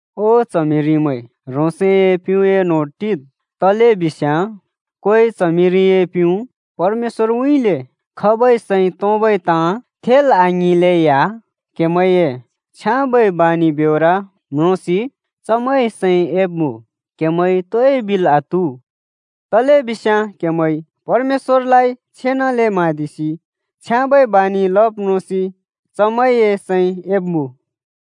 ओ च्हमिरिमैं, ह्रोंसए प्‍युँए न्होंर टिद्। तलेबिस्याँ कोइ च्हमिरिए प्‍युँ परमेश्‍वरउँइँले खबै सैं तोंबै ताँ थेल् आङिंलेया क्हेमैंए छ्याँबै बानि ब्योर म्रोंसि चमैंए सैं एब्‍मुँ। क्हेमैंइ तोइ बिल् आत्‍हु, तलेबिस्याँ क्हेमैंइ परमेश्‍वरलाइ छेनाले म्हाँदिसि छ्याँबै बानि लब् म्रोंसि चमैंए सैं एब्‍मुँ।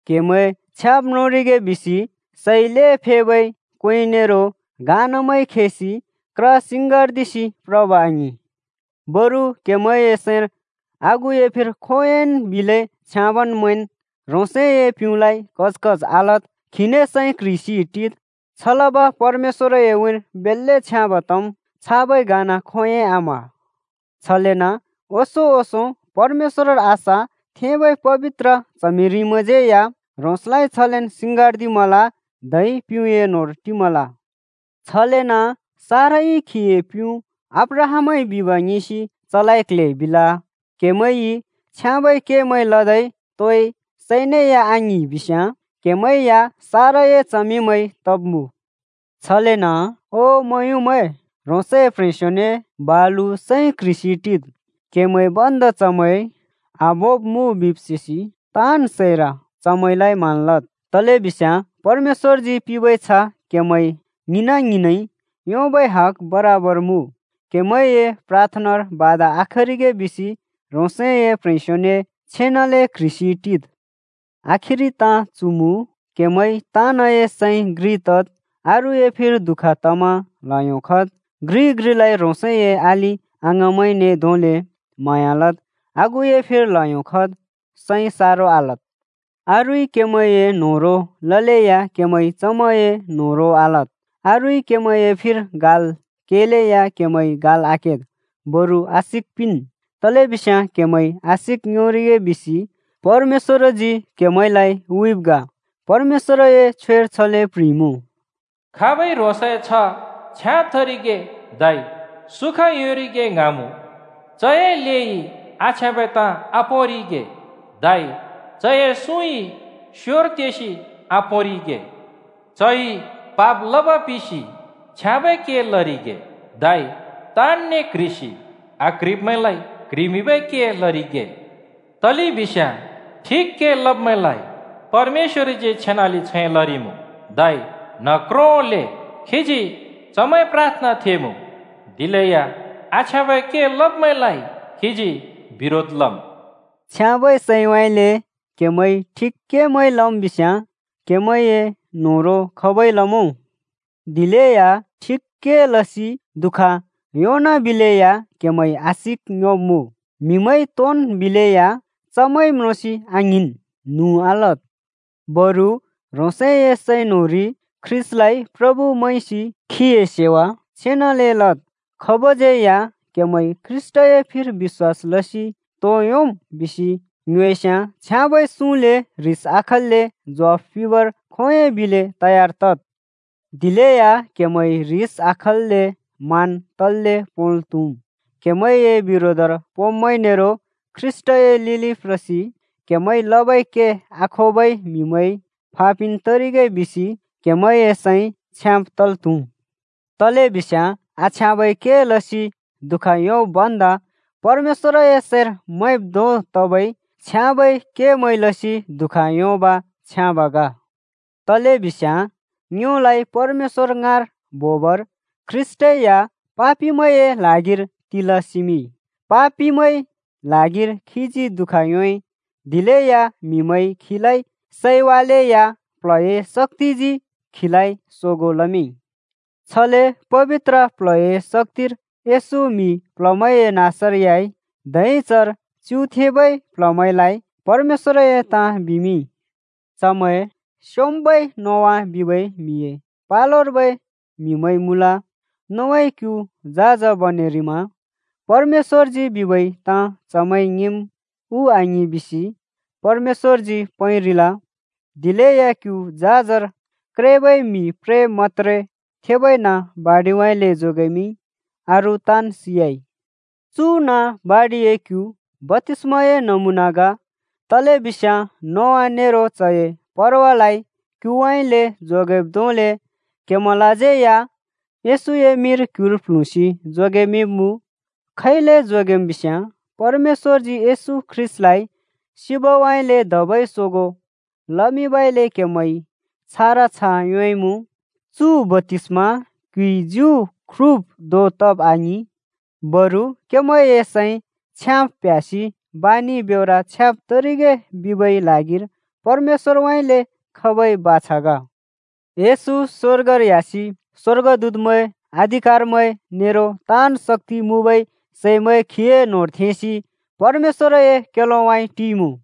क्‍हेमैं छ्याँब् म्रोंरिगे बिसि सै ल्हें फेबै क्‍वें नेरो घाँनामैं खिसि क्र सिंङ्गार्दिसि प्रब आङिं। बरु क्हेमैंए सैंर आगुए फिर खोंयोंन् बिलै छ्याँब मैंन्। ह्रोंसए प्‍युँलाइ कच कच आलद्, खीने सैं क्‍ह्रिसि टिद्, छलब परमेश्‍वरए उँइँर बेल्‍ले छ्याँब तम्, छाबै घाँना खोंयोंइ आम्‍ह। छलेन ओंसों ओंसों परमेश्‍वरर आशा थेंबै पबित्र च्हमिरिमैंज्यै या ह्रोंसलाइ छलेन् सिङ्गार्दिमल धै प्युँए न्होंर टिमल। छलेन साराई खीए प्युँ अब्राहामइ बिब ङिंसि चलाइ क्ल्हे बिल। क्हेमैंइ छ्याँबै केमैं लदै तोइ सैनेया आङ्हिंइ बिस्याँ क्‍हेमैं या साराए च्हमिंमैं तब्मुँ। छलेन ओ मुँयुँमैं, ह्रोंसए प्ह्रेंस्योने बालु सैं क्ह्रिसि टिद्। क्‍हेमैं भन्दा चमैं आभोंब् मुँ बिब् सेसि ताँन् सैर चमैंलाइ मान लद्, तलेबिस्याँ परमेश्‍वरजी पिंबै छ्ह क्‍हेमैं ङ्हिंना-ङ्हिंनइ योंबै हग बराबर मुँ। क्‍हेमैंए प्राथनार बाधा आखरिगे बिसि ह्रोंसए प्ह्रेंस्योने छेनाले क्‍ह्रिसि टिद्। आखिरि ताँ चु मुँ: क्‍हेमैं ताँनए सैं घ्रि तद्। अरूए फिर दुःख तमा ल्‍हयो खद्। घ्रिइ घ्रिलाइ ह्रोंसए अलि-अङाँमैंने धोंले म्हाँया लद्। आगुए फिर ल्हयो खद्, सैं सारो आलद्। अरूइ क्हेमैंए न्होह्रों ललेया क्हेमैंइ चमैंए न्होह्रों आलद्, अरूइ क्‍हेमैंए फिर गाल् केलेया क्हेमैंइ गाल् आकेद्। बरु आशिक पिंन्, तलेबिस्याँ क्‍हेमैंइ आशिक योंरिगे बिसि परमेश्‍वरजी क्‍हेमैंलाइ हुइब् ग। परमेश्‍वरए छ्वेर छले प्ह्रिइमुँ: “खाब‍इ ह्रोंसए छ्ह छ्याँब तरिगे धै सुखा योंरिगे ङ्हाँमुँ, चए लेइ आछ्याँबै ताँ आपोंरिगे, धै चए सुँइ स्‍योर तेसि आपोंरिगे। चइ पाप लब पिसि छ्याँबै के लरिगे, धै ताँनने क्ह्रिसि आक्ह्रिब्मैंलाइ क्ह्रिमिंबै के लरिगे। तलेबिस्याँ ठिक के लब्‍मैंलाइ परमेश्‍वरजी छेनाले छैं लरिमुँ, धै न्ह क्रोंले खीजी चमैंए प्राथना थेमुँ, दिलेया आछ्याँबै के लब्‍मैंलाइ खीजी बिरोधर लम्।” छ्याँबै सैंउँइँले क्‍हेमैंइ ठिक केमैं लम् बिस्‍याँ, क्‍हेमैंए न्होह्रों खाबइ लमुँ? दिलेया ठिक के लसि दुःख योंनाबिलेया क्‍हेमैंइ आशिक योंब्मुँ। म्‍हिमैंइ तोन् बिलेया चमैं म्रोंसि आङ्हिंन्, न्हुँ आलद्। बरु ह्रोंसए सैं न्‍होंरि ख्रीष्‍टलाइ “प्रभु” मैंसि खीए सेवा छेनाले लद्। खाबज्यै या “क्हेमैंइ ख्रीष्‍टए फिर बिश्‍वास लसि तो योंम्?” बिसि ङ्योएस्याँ छ्याँबै सुँले ह्रिस आखल्‍ले ज्वाफ पिंबर खोंयोंइ बिले तयार तद्। दिलेया क्हेमैं ह्रिस आखल्‍ले, मान तल्‍ले पोंल् त्हुम्। क्हेमैंए बिरोधर पोंब्मैं नेरो ख्रीष्‍टए लिलि प्रसि क्हेमैंइ लबै के आखोबै म्हिमैं फापिन् तरिगे बिसि क्हेमैंए सैं छ्याँब तल् त्हुम्। तलेबिस्याँ आछ्याँबै के लसि दुःख योंब् भन्दा परमेश्‍वरए सैंर मैंब् धों तबै छ्याँबै केमैं लसि दुःख योंब छ्याँब ग। तलेबिस्याँ ङ्योलाइ परमेश्‍वर ङाँर बोबर ख्रीष्‍टै या पापिमैंए ल्हागिर तिल सिमिंइ। पापिमैंए ल्हागिर खीजी दु:ख योंइ। दिलेया म्हिमैंइ खीलाइ सैवालेया प्ल्हए शक्‍तिजी खीलाइ सोगों लमिंइ। छले पबित्र प्ल्हए शक्‍तिर येशू म्‍हि प्‍ल्‍हमैंए नाँसर ह्‍याइ, धै चर च्युथेंबै प्‍ल्‍हमैंलाइ परमेश्‍वरए ताँ बिमिंइ। चमैं स्‍योंम्‍बै नोआ बिबै म्‍हिए पलोर्बै म्‍हिमैं मुँल। नोआइ क्यु झाज बनेरिमा परमेश्‍वरजी बिबै ताँ चमैंइ ङिंम् उ आङिं बिसि परमेश्‍वरजी पैंरिल। दिलेया क्यु झाजर क्रेबै म्हि प्रे मत्‍त्रे थेबै नाँ बाडिउँइँले जोगेमिंइ, अरू ताँन् सियाइ। चु नाँ बाडिए क्यु बप्‍तिस्‍माए नमुना ग, तलेबिस्याँ नोआ नेरो चए परवालाइ क्‍युउँइँले जोगेब् धोंले क्‍हेमैंलाज्यै या येशूए मिंर क्‍युर प्ल्हुँसि जोगेमिंब्मुँ। खैले जोगेम् बिस्‍याँ परमेश्‍वरजी येशू ख्रीष्‍टलाइ सिबइले धबै सोगों लमिंबइले क्‍हेमैंइ छारा छ्ह योंइमुँ। चु बप्‍तिस्‍मा क्‍युइ ज्यु ख्रुब् धों तब आङिं, बरु क्‍हेमैंए सैं छ्याँब् प्ह्‍यासि बानि ब्योर छ्याँब् तरिगे बिबै ल्हागिर परमेश्‍वरउँइँले खबै बाछा ग। येशू स्‍वर्गर ह्‍यासि स्वर्गदूतमैं, अधिकारमैं नेरो ताँन् शक्‍ति मुँबै सैमैं खीए न्होंर थेंसि परमेश्‍वरए क्‍योलोउँइँ टिइमुँ।